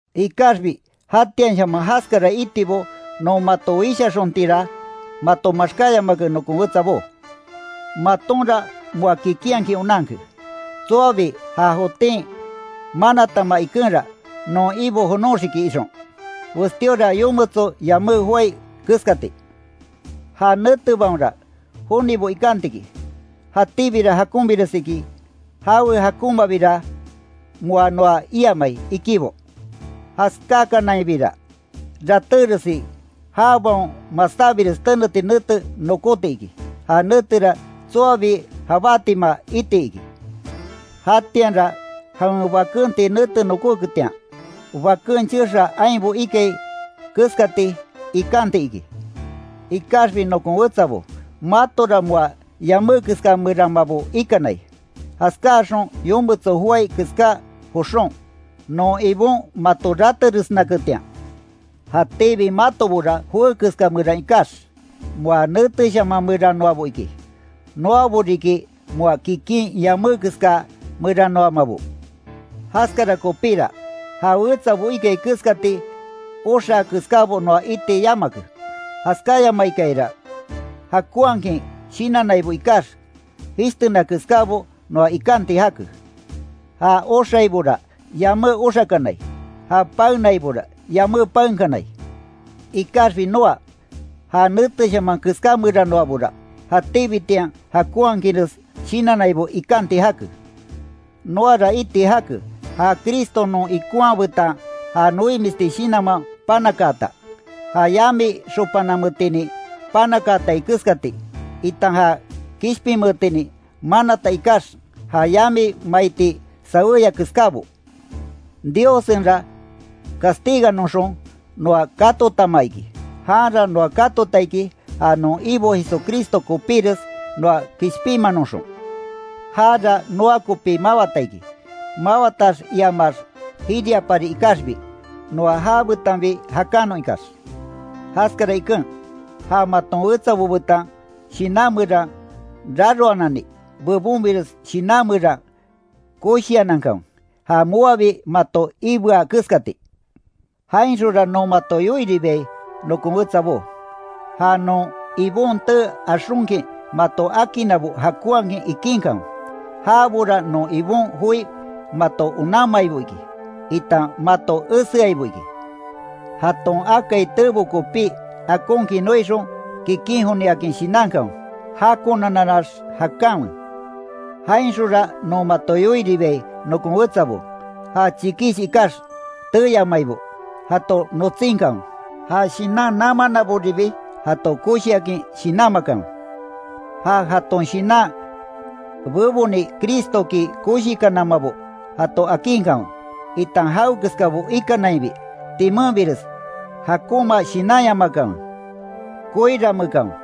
Ikaxbi jatianshaman jaskara itibo non mato wishaxontinra mato maxkáyamake, nokon wetsabó. Matonra moa kikinhakin onanke, tsoabi ja jotin manatama ikenra, non Ibo jonoxiki ixon, westíora yometso yamé joái keskati. Ja netebaonra, jonibo ikanti iki: “Jatíbira jakonbires iki, jawe jakonmabira moa noa iamai”, ikibo. Jaskákanainbira, ratéresi jabaon masábires teneti nete nokóti iki, ja netera tsoabi jabátima iti iki. Jatianra jawen bakenti nete nokóketian, baken chexaa ainbo ikai keskati, ikanti iki. Ikaxbi nokon wetsabo, matora moa yamé keska meranmabo ikanai, jaskáaxon yometso joái keská joxon, non Ibon mato rateresnaketian. Jatíbi matobora joé keska meran ikax, moa néteshaman merannoabo iki. Noabo riki moa kikin yamé keska meranoamabo. Jaskara kopíra, ja wetsabo ikai keskati, oxaa keskábo noa iti yamake, jaskáyamaikayara, jakonhakin shinannaibo ikax, jishtena keskábo noa ikanti jake. Ja oxaibora, yamé oxakanai, ja paenaibora, yamé paenkanai. Ikaxbi noa, ja néteshaman keská meranoabora, jatíbitian jakonhakinres shinannaibo ikanti jake. Noara iti jake, ja Cristo non ikonha betan ja noimisti shinanman panakaata, ja yami xopanametinin panakaatai keskati, itan ja kishpinmeetinin manata ikax, ja yami maiti saweya keskábo. Diossenra castiganoxon, noa katotama iki, janra noa katota iki, ja non Ibo Jesucristo kopíres, noa kishpinmanoxon. Jara noa kopi mawata iki, mawatax iamax jiriapari ikaxbi, noa jabetanbi jakanon ikax. Jaskara iken, ja maton wetsabo betan shinan meran raroananni, bebonbires shinan meran koshianankanwe, ja moabi mato iibea keskati. Jainxonra non mato yoiribiai, nokon wetsabó, ja non Ibon tee axonkin mato akinnabo jakonhakin ikinkanwe; jabora non Ibon joi mato onanmaibo iki, itan mato eseaibo iki. Jaton akai teebo kopí, akonkin noixon, kikin joniakin shinankanwe. Jakonanannax jakanwe. Jainxonra non mato yoiribiai, nokon wetsabo; ja chikish ikax teeyamaibo, jato notsinkanwe, ja shinan namannaboribi jato koshiakin shinanmakanwe. Ja jaton shinan beboni Cristoki koshikanamabo jato akinkanwe, itan jawekeskabo ikanainbi, timenbires jakonma shinanyamakanwe. Koiranmeekanwe,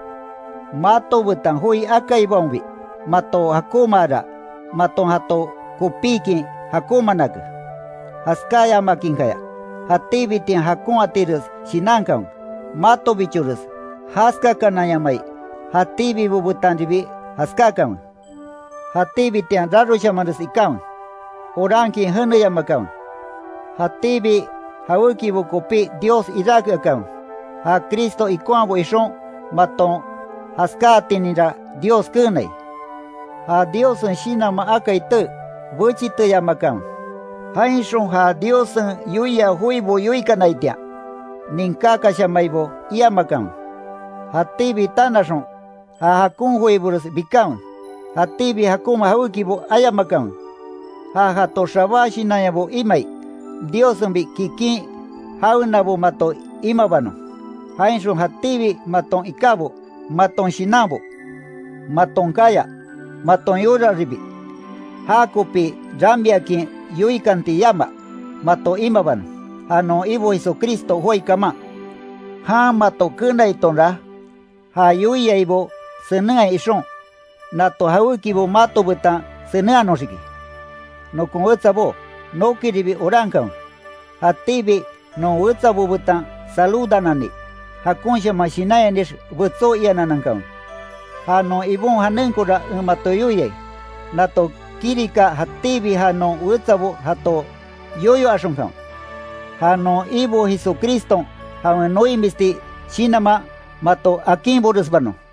mato betan joi akaibaonbi mato jakonmaara, maton jato kopíkin jakonmaanake; jaskáyamakinkaya, jatíbitian jakon atires shinankanwe, matobichores jaskakananyamai, jatíbibo betanribi jaskákanwe. Jatíbitian raroshamanres ikanwe. Orankin jeneyamakanwe. Jatíbi jawékibo kopí Dios iráke akanwe, ja Cristo ikonhabo ixon, maton jaskáatininra Dios keenai. Ja Diossen Shinanman akai tee, bechiteyamakanwe. Jainxon ja Diossen yoia joibo yoikanaitian, ninkákashamaibo iamakanwe. Jatíbi tanaxon, ja jakon joibores bikanwe. Jatíbi jakonma jawékibo ayamakanwe. Ja jato xabá shinanyabo imai, Diossenbi kikin jawenabo mato imabanon; jainxon jatíbi maton ikábo, maton shinanbo, maton kaya, maton yoraribi, jakopi ramiakin yoikanti yama, mato imabanon. Ja non Ibo Jesucristo joái kaman. Jan mato kenaitonra, ja yoiaibo senenhai ixon, nato jawékibo mato betan senenhanoxiki. Nokon wetsabó, nokiribi orankanwe. Jatíbi non wetsabo betan saludanani, jakonshaman shinanyanix betsó iananan kanwe. Ja non Ibon janenkora en mato yoiai, nato kirika jatíbi ja non wetsabo jato yoyo axonkanwe. Ja non Ibo Jesucriston jawen noimisti shinanman, mato akinboresbanon.